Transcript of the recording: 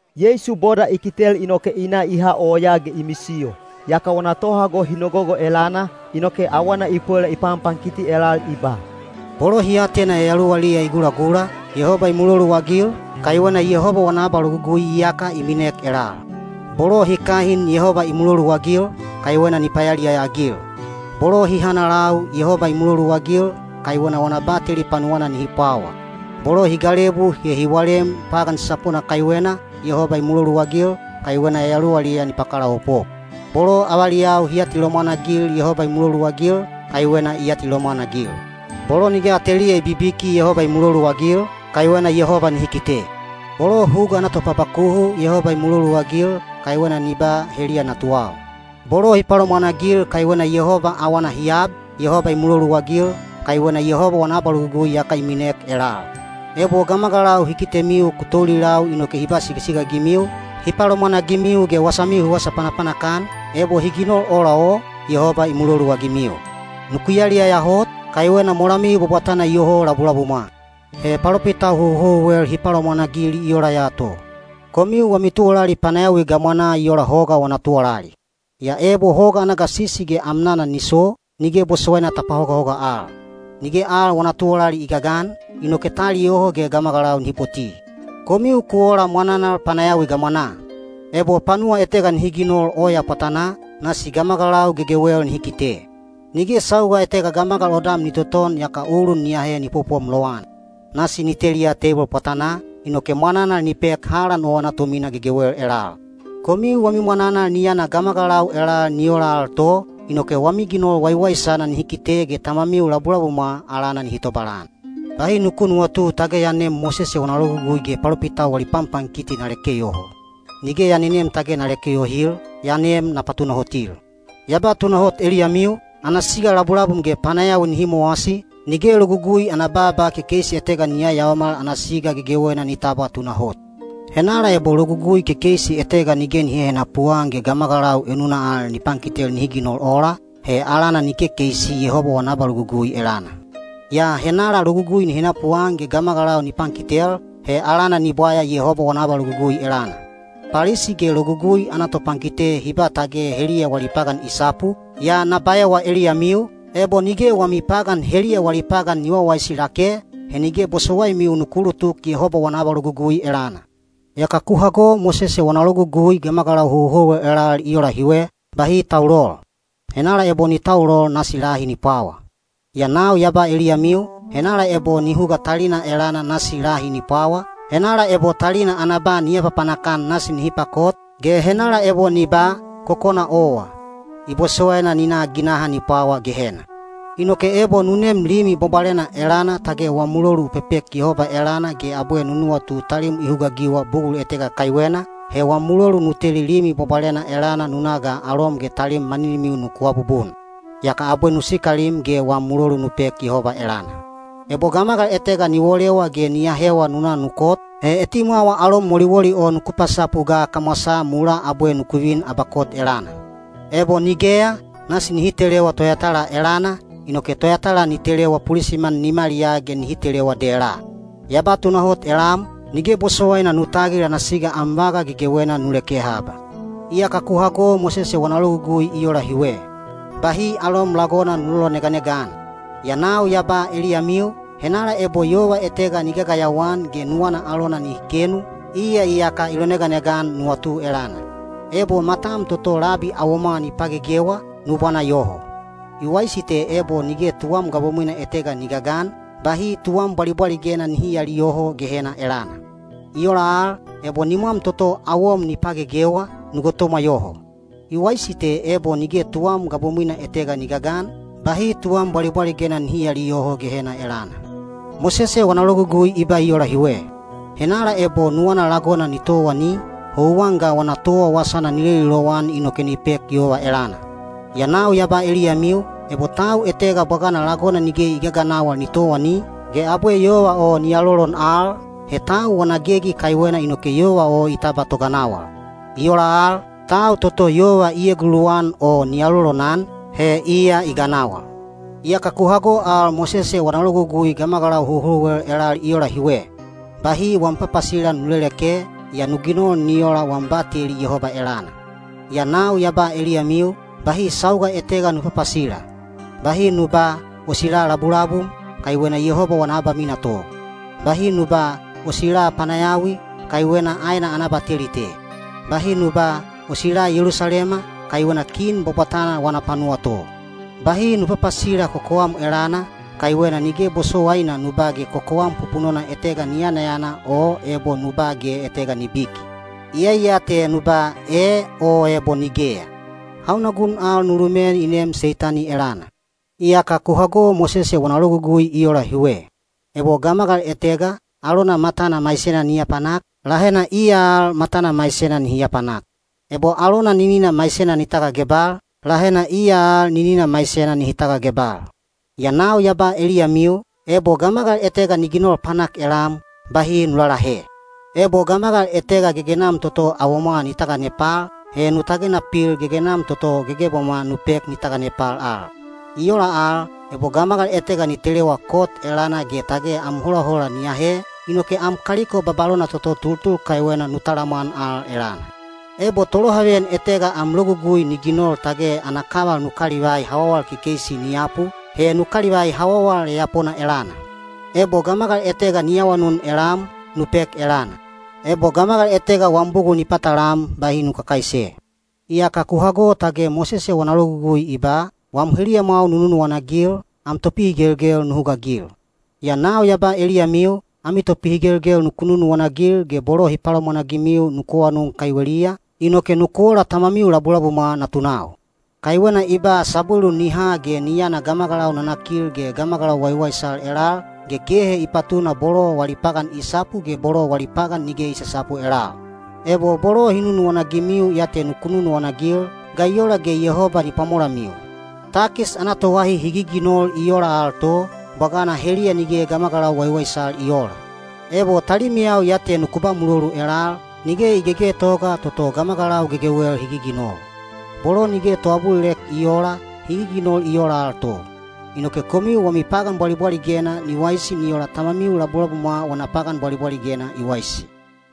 Yeisu boda i kitel inoke i na i ha oyaa ge i misiyo. Yaka wana tohago hi nogogo elana, inoke awana i pwela i panpankiti elal i ba: Bolo hi atena yayaluwaliya i gulagula, Yehoba i muloluagil, kaiwena Yehoba wana abalogugui iyaka i minek elal. Bolo hi kahin Yehoba i muloluagil, kaiwena ni payaliyaya-agil. Bolo hi hanalau Yehoba i muloluagil, kaiwena wana bateli panuwana nihi pwawa. Bolo hi galebu ge hi walem pagan sasapona kaiwena, Yehoba i muloluagil, kaiwena yayaluwaliya ni pakalaopop. Bolo avaliyau hi atilomwan-agil Yehoba i muloluagil, kaiwena i atilomwan-agil. Bolo nige ateliya i bibiki Yehoba i muloluagil, kaiwena Yehoba nihi kite. Bolo huga ana topabakuhu Yehoba i muloluagil, kaiwena ni ba, “Heliya natuwau.” Bolo hi palomwanagil kaiwena Yehoba awana hi ab, Yehoba i muloluagil, kaiwena Yehoba wana abalogugui iyaka i minek elal. Ebo gamagalau hi kitemiu ku toulilau inoke hi ba sigasiga-agimiu, hi palomwanagimiu ge wasamiu hi wasa panapanak-an, ebo hi ginol ola o, Yehoba i muloluagimiu. Nuku yaliyaya hot, kaiwena molamiu bwabwatana iyoho labulabumwa. He palopitau houhouwel hi palomwanagil i ola ya to. Komiu wami tuwalali panayawi gamwanaa i ola hoga wana tuwalali. Yaa ebo hoga ana gasisi ge amnana ni so, nige bosowaina ta pahogahoga al. Nige al wana tuwalali i gagan, inoke ta aliyoho ge gamagalau nihi poti. Komiu ku ola mwananal panayawi gamwanaa. Ebo panuwa etega nihi ginol oya pwatanaa, nasi gamagalau gegewel nihi kite. Nige sauga etega gamagal odam ni toton yaka ulun ni aahe ni popom lowan. Nasi ni teliya teibol pwatanaa, inoke mwananal ni pek halan o ana tomina gegewel elal. Komiu wami mwananal ni yana gamagalau elal ni ola al to, inoke wami ginol waiwaisana nihi kite ge Tamamiu labulabumwa alana nihi tobalan. Bahi nuku nuwatu tage ya nem Mosese wana Logugui ge palopitau wali panpankiti na leke yoho. Nige ya nenem tage na lekel yohil, ya nem na patunahotil. Ya ba tunahot eliyamiu, ana siga labulabum ge panayawi nihi mowasi, nige Logugui ana baaba kekeisi etega ni yayaomal ana siga gegewena ni tabwa tunahot. Henala ebo logugui kekeisi etega nige ni hehenapu-an ge gamagalau enuna al ni pankitel nihi ginol ola, he alana ni kekeisi Yehoba wana abalogugui elana. Yaa henala logugui ni henapuan ge gamagalau ni pankitel, he alana ni bwaya Yehoba wana abalogugui elana. Palisi ge Logugui ana topankite hi ba tage heliya wali pagan i sapu, yaa na baewa eliyamiu, ebo nige wami pagan heliya wali pagan ni wawaisi lake, he nige bosowaimiu nuku ulutuk Yehoba wana abalogugui elana. Iyaka ku hago Mosese wana logugui gamagalau houhouwel elal i ola hiwe, “Bahi taulol. Henala ebo ni taulol nasi lahi ni pwawa.” Yaa nau ya ba eliyamiu, henala ebo ni huga talina elana nasi lahi ni pwawa, henala ebo talina ana ba ni apapanak-an nasi nihi pakot, ge henala ebo ni ba, “Kokona owa!” i bosowaina ni na ginaha ni pwawa Gehena. Inoke ebo nu nem limi bwabwalena elana tage wam mulolu u pepek Yehoba elana ge abwe nu nuwatu talim i hugaagiwa bugul etega kaiwena, he wam mulolu nu teli limi bwabwalena elana nu na ga alom ge talim maninimiu nuku abubun. Yaka abwe nu sikalim ge wam mulolu nu pek Yehoba elana. Ebo gamagal etega ni wolewa ge ni ahewa nuku na nu kot, he etimwawa alom woliwoli o nuku pasapu ga kamwasaa mulaa abwe nuku vin abakot elana. Ebo nigeya, nasi ni telewa toyatala elana, inoke toyatala ni telewa pulisiman nimaliyaa ge nihi telewa dela. Ya ba tunahot elam, nige bosowaina nu tagil ana siga am vaga gegewena nu leke haba. Iyaka ku hago Mosese wana logugui i ola hiwe, “Bahi alom lagona nu loloneganega-an.” Yaa nau ya ba eliyamiu, henala ebo yova etega ni gagayawa-an ge nuwana alona nihi kenu, iya iyaka i loneganega-an nuwatu elana. Ebo matam toto labi awomwa ni pagegewa, nu bwana yoho. I waisi te ebo nige tuwam gabomwina etega ni gagan, bahi tuwam bwalibwaligena nihi aaliyoho Gehena elana. I ola al, ebo nimwam toto awom ni pagegewa, nu gotomwa yoho. I waisi te ebo nige tuwam gabomwina etega ni gagan, bahi tuwam bwalibwaligena nihi aaliyoho Gehena elana. Mosese wana logugui i ba i ola hiwe, “Henala ebo nuwana lagona ni towani, houwan ga wana towa wasana ni leli lowan inoke ni pek yova elana.” Yaa nau ya ba eliyamiu, ebo tau etega bwagana lagona nige i gaganawal ni towani, ge abwe yova o ni alolon al, he tau wana gegi kaiwena inoke yova o i tabwa toganawal. I ola al, tau toto yova eguluwan o ni alolonan, he iya i ganawal. Iyaka ku hago al Mosese wana logugui gamagalau houhouwel elal i ola hiwe, “Bahi wam papasila nu leleke, yaa nu ginol ni ola wam bateli Yehoba elana.” Yaa nau ya ba eliyamiu, bahi sauga etega nu papasila. Bahi nu ba, “O sila labulabum,” kaiwena Yehoba wana abamina to. Bahi nu ba “O sila panayawi,” kaiwena aena ana abateli te. Bahi nu ba, “O sila Yelusalema,” kaiwena Kin bwabwatana wana panuwa to. Bahi nu papasila kokowam elana, kaiwena nige bosowaina nu ba ge kokowam pupunona etega ni yanayana o ebo nu ba ge etega ni biki. Iyai ya te nu ba, “E” o ebo “Nigeya”. Hauna gun al nu lumen i neem Seitani elana. Iyaka ku hago Mosese wana logugui i ola hiwe, “Ebo gamagal etega, alona matana maisena ni apanak, lahena iya al matana maisena nihi apanak. Ebo alona ninina maisena ni tagagebal, lahena iya al ninina maisena nihi tagagebal.” Yaa nau ya ba eliyamiu, ebo gamagal etega ni ginol panak elam, bahi nu lalahe. Ebo gamagal etega gegenam toto awomwa ni taganepal, he nu tagena pil gegenam toto gegebamwa nu pek ni taganepal al. I ola al, ebo gamagal etega ni telewa kot elana ge tage am holahola ni ahe, inoke am kaliko babalona toto tultul kaiwena nu talamwan al elana. Ebo tolohaveyan etega am logugui ni ginol tage ana kaval nu kalivai hawawal kekeisi ni yapu, he nu kalivai hawawal yayapona elana. Ebo gamagal etega ni awanun elam, nu pek elana; ebo gamagal etega wam bugul ni patalam, bahi nu kakaise. Iyaka ku hago tage Mosese wana logugui i ba, “Wam heliyamwau nu nunuwana-agil, am topihigelgel nu hugaagil.” Yaa nau ya ba eliyamiu, ami topihigelgel nuku nunuwana-agil ge bolo hi palomwanagimiu nuku awanun kaiweliya, inoke nuku ola Tamamiu labulabumwa natunau. Kaiwena i ba sabwelu ni ha ge ni yana gamagalau nanakil ge gamagalau waiwaisal elal, ge kehe i patuna bolo wali pagan i sapu ge bolo wali pagan nige i sasapu elal. Ebo bolo hi nunuwana-agimiu ya te nuku nunuwana-agil, ga i ola ge Yehoba ni pwamolamiu? Takis ana toahi hi giginol i oola al to, bwagana heliya nige gamagalau waiwaisal i oola. Ebo talimiyau ya te nuku ba mulolu elal, nige i gegetoga toto gamagalau gegewel hi giginol. Bolo nige toabulilek i oola, hi giginol i oola al to. Inoke komiu wami pagan bwalibwaligena ni waisi ni ola Tamamiu labulabumwa wana pagan bwalibwaligena i waisi.